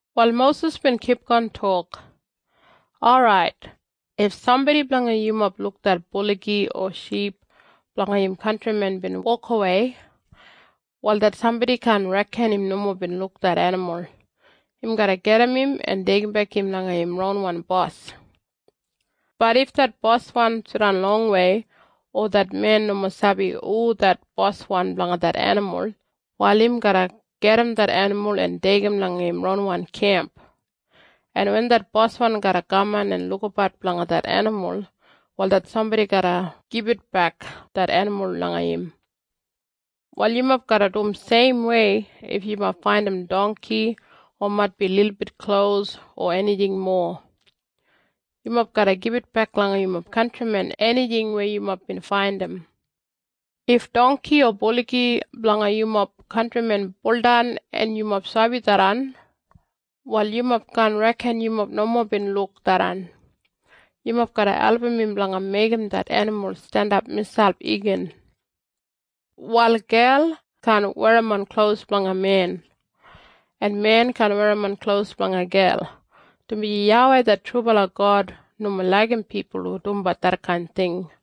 Wal Mosis bin kipgon tok, “Orait, if sambodi blanga yumob luk det buligi o ship blanga im kantrimen bin wokawei, wal det sambodi kaan reken im nomo bin luk det enimul. Im garra gajim im en deigimbek im langa im ronwan bos. Bat if det boswan jidan longwei, o det men nomo sabi hu det boswan blanga det enimul, wal im garra gajim det enimul en deigim langa im ronwan kemp, en wen det boswan garra kaman en lukabat blanga det enimul, wal det sambodi garra gibitbek det enimul langa im. Wal yumob garra dum seimwei if yumob faindim dongki o maitbi lilbit klos o enijing mowa. Yumob garra gibitbek langa yumob kantrimen enijing weya yumob bin faindim. “If dongki o buligi blanga yumob kantrimen buldan en yumob sabi tharran, wal yumob kaan reken yumob nomo bin luk tharran. Yumob garra album im blanga meigim det enimul jandap miselp igin. “Wal gel kaan werrimon klos blanga men, en men kaan werrimon klos blanga gel, dumaji YAWEI det trubala God nomo laigim pipul hu dumbat detkain ting.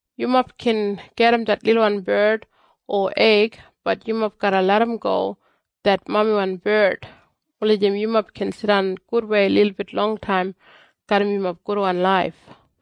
Yumob gin gajim det lilwan bard o eig, bat yumob garra larramgo det mamiwan bard, wulijim yumob gin jidan gudwei lilbit longtaim garram yumob gudwan laif.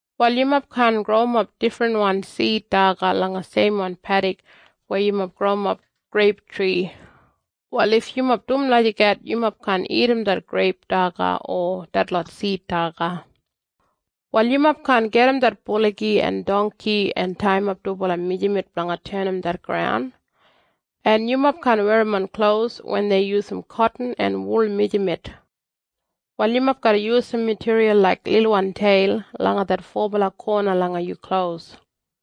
“Wal yumob kaan growimap difrinwan sid daga langa seimwan pedik weya yumob growimap greiptri. Wal if yumob dum lagijat yumob kaan dagat detlot greip daga o detlot sid daga. “Wal yumob kaan gajim det buligi en dongki en taiyimap dubala mijamet blanga tenim det graun. “En yumob kaan werrimon klos wen dei yusum kotin en wol mijamet. “Wal yumob garra yusum matiriyal laik lilwan teil langa det fobala kona langa yu klos.”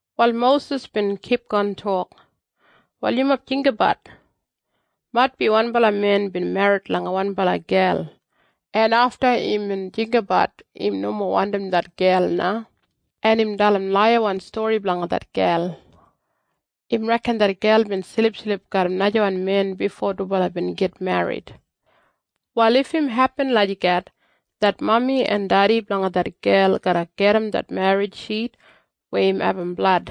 Wal Mosis bin kipgon tok, “Wal yumob jinggabat. Maitbi wanbala men bin merrit langa wanbala gel, en afta imbin jinggabat im nomo wandim det gel na, en im dalim laiyawan stori blanga det gel. Im reken det gel bin silipsilip garram najawan men bifo dubala bin git merrit. “Wal if im hepin lagijat, det mami en dedi blanga det gel garra gajim det merrit shit weya im abum blad.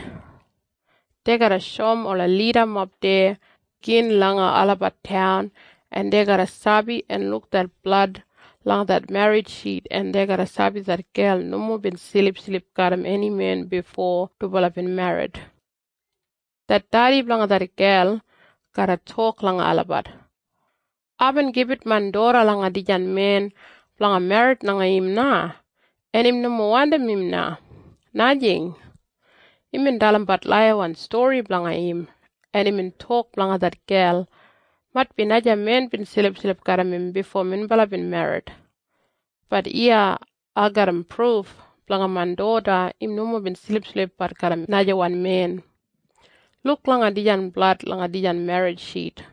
Dei garra shoum ola lidamob deya gin langa olabat taun en dei garra sabi en luk det blad langa det merrit shit en dei garra sabi det gel nomo bin silipsilip garram eni men bifo dubala bin merrit. Det dedi blanga det gel garra tok langa olabat, ‘Aibin gibit main doda langa dijan men blanga merrit langa im na, en im nomo wandim im na, najing. Imbin dalimbat laiyawan stori blanga im, en imbin tok blanga det gel, “Maitbi naja men bin silipsilip garram im bifo minbala bin merrit.” Bat iya ai garram pruf blanga main doda im nomo bin silipsilipbat garram najawan men. Luk langa dijan blad langa dijan merrit shit!’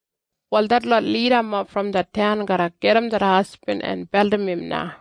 “Wal detlot lidamob brom det taun garra gajim det hasbin en beldim im na.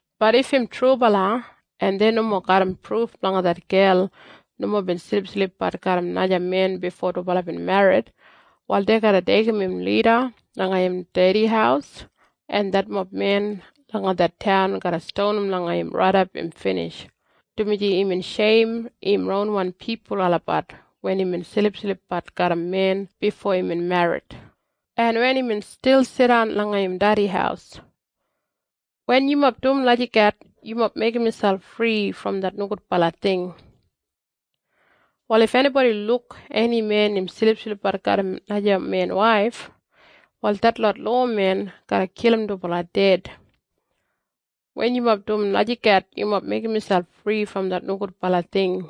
“Bat if im trubala, en dei nomo garram pruf blanga det gel nomo bin silipsilipbat garram naja men bifo dubala merrit, wal dei garra deigim im lida langa im dedi haus, en detmob men langa det taun garra stonim langa im raidap im binij, dumaji imbin sheim im ronwan pipul olabat wen imbin silipsilipbat garram men bifo imbin merrit, en wen imbin stil jidan langa im dedi haus. Wen yumob dum lagijat yumob meigim miselp fri brom det nogudbala ting. “Wal if enibodi luk eni men im silipsilipbat garram naja men waif, wal detlot lowamen garra kilim dubala ded. Wen yumob dum lagijat yumob meigim miselp fri brom det nogudbala ting.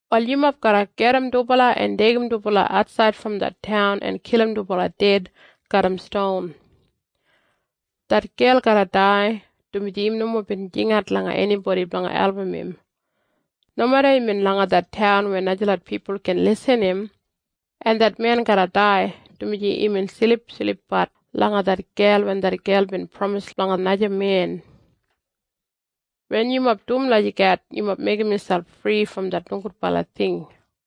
Wal yumob garra gajim dubala en deigim dubala atsaid brom det taun en kilim dubala ded garram ston. Det gel garra dai, dumaji im nomo bin jingat langa enibodi blanga album im, nomeda imbin langa det taun weya najalot pipul gin irrim im. En det men garra dai, dumaji imbin silipsilipbat langa det gel wen det gel bin pramis blanga naja men. Wen yumob dum lagijat yumob meigim miselp fri brom det nogudbala ting.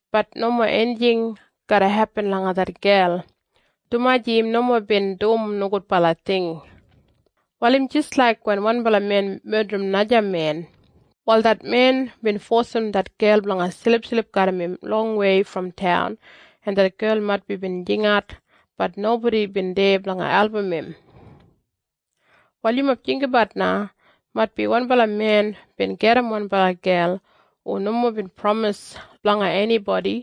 bat nomo enijing garra hepin langa det gel, dumaji im nomo bin dum nogudbala ting. Wal im jis laik wen wanbala men medrim naja men. Wal det men bin fosim det gel blanga silipsilip garram im longwei brom taun en det gel maitbi bin jingat, bat nobodi bin deya blanga album im. “Wal yumob jinggabat na. Maitbi wanbala men bin gajim wanbala gel hu nomo bin pramis blanga enibodi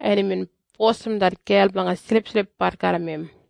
en imbin fosim det gel blanga silipsilipbat garram im.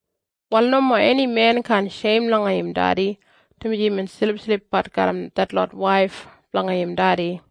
“Wal nomo eni men kaan sheim langa im dedi dumaji imbin silipsilipbat garram detlot waif blanga im dedi.”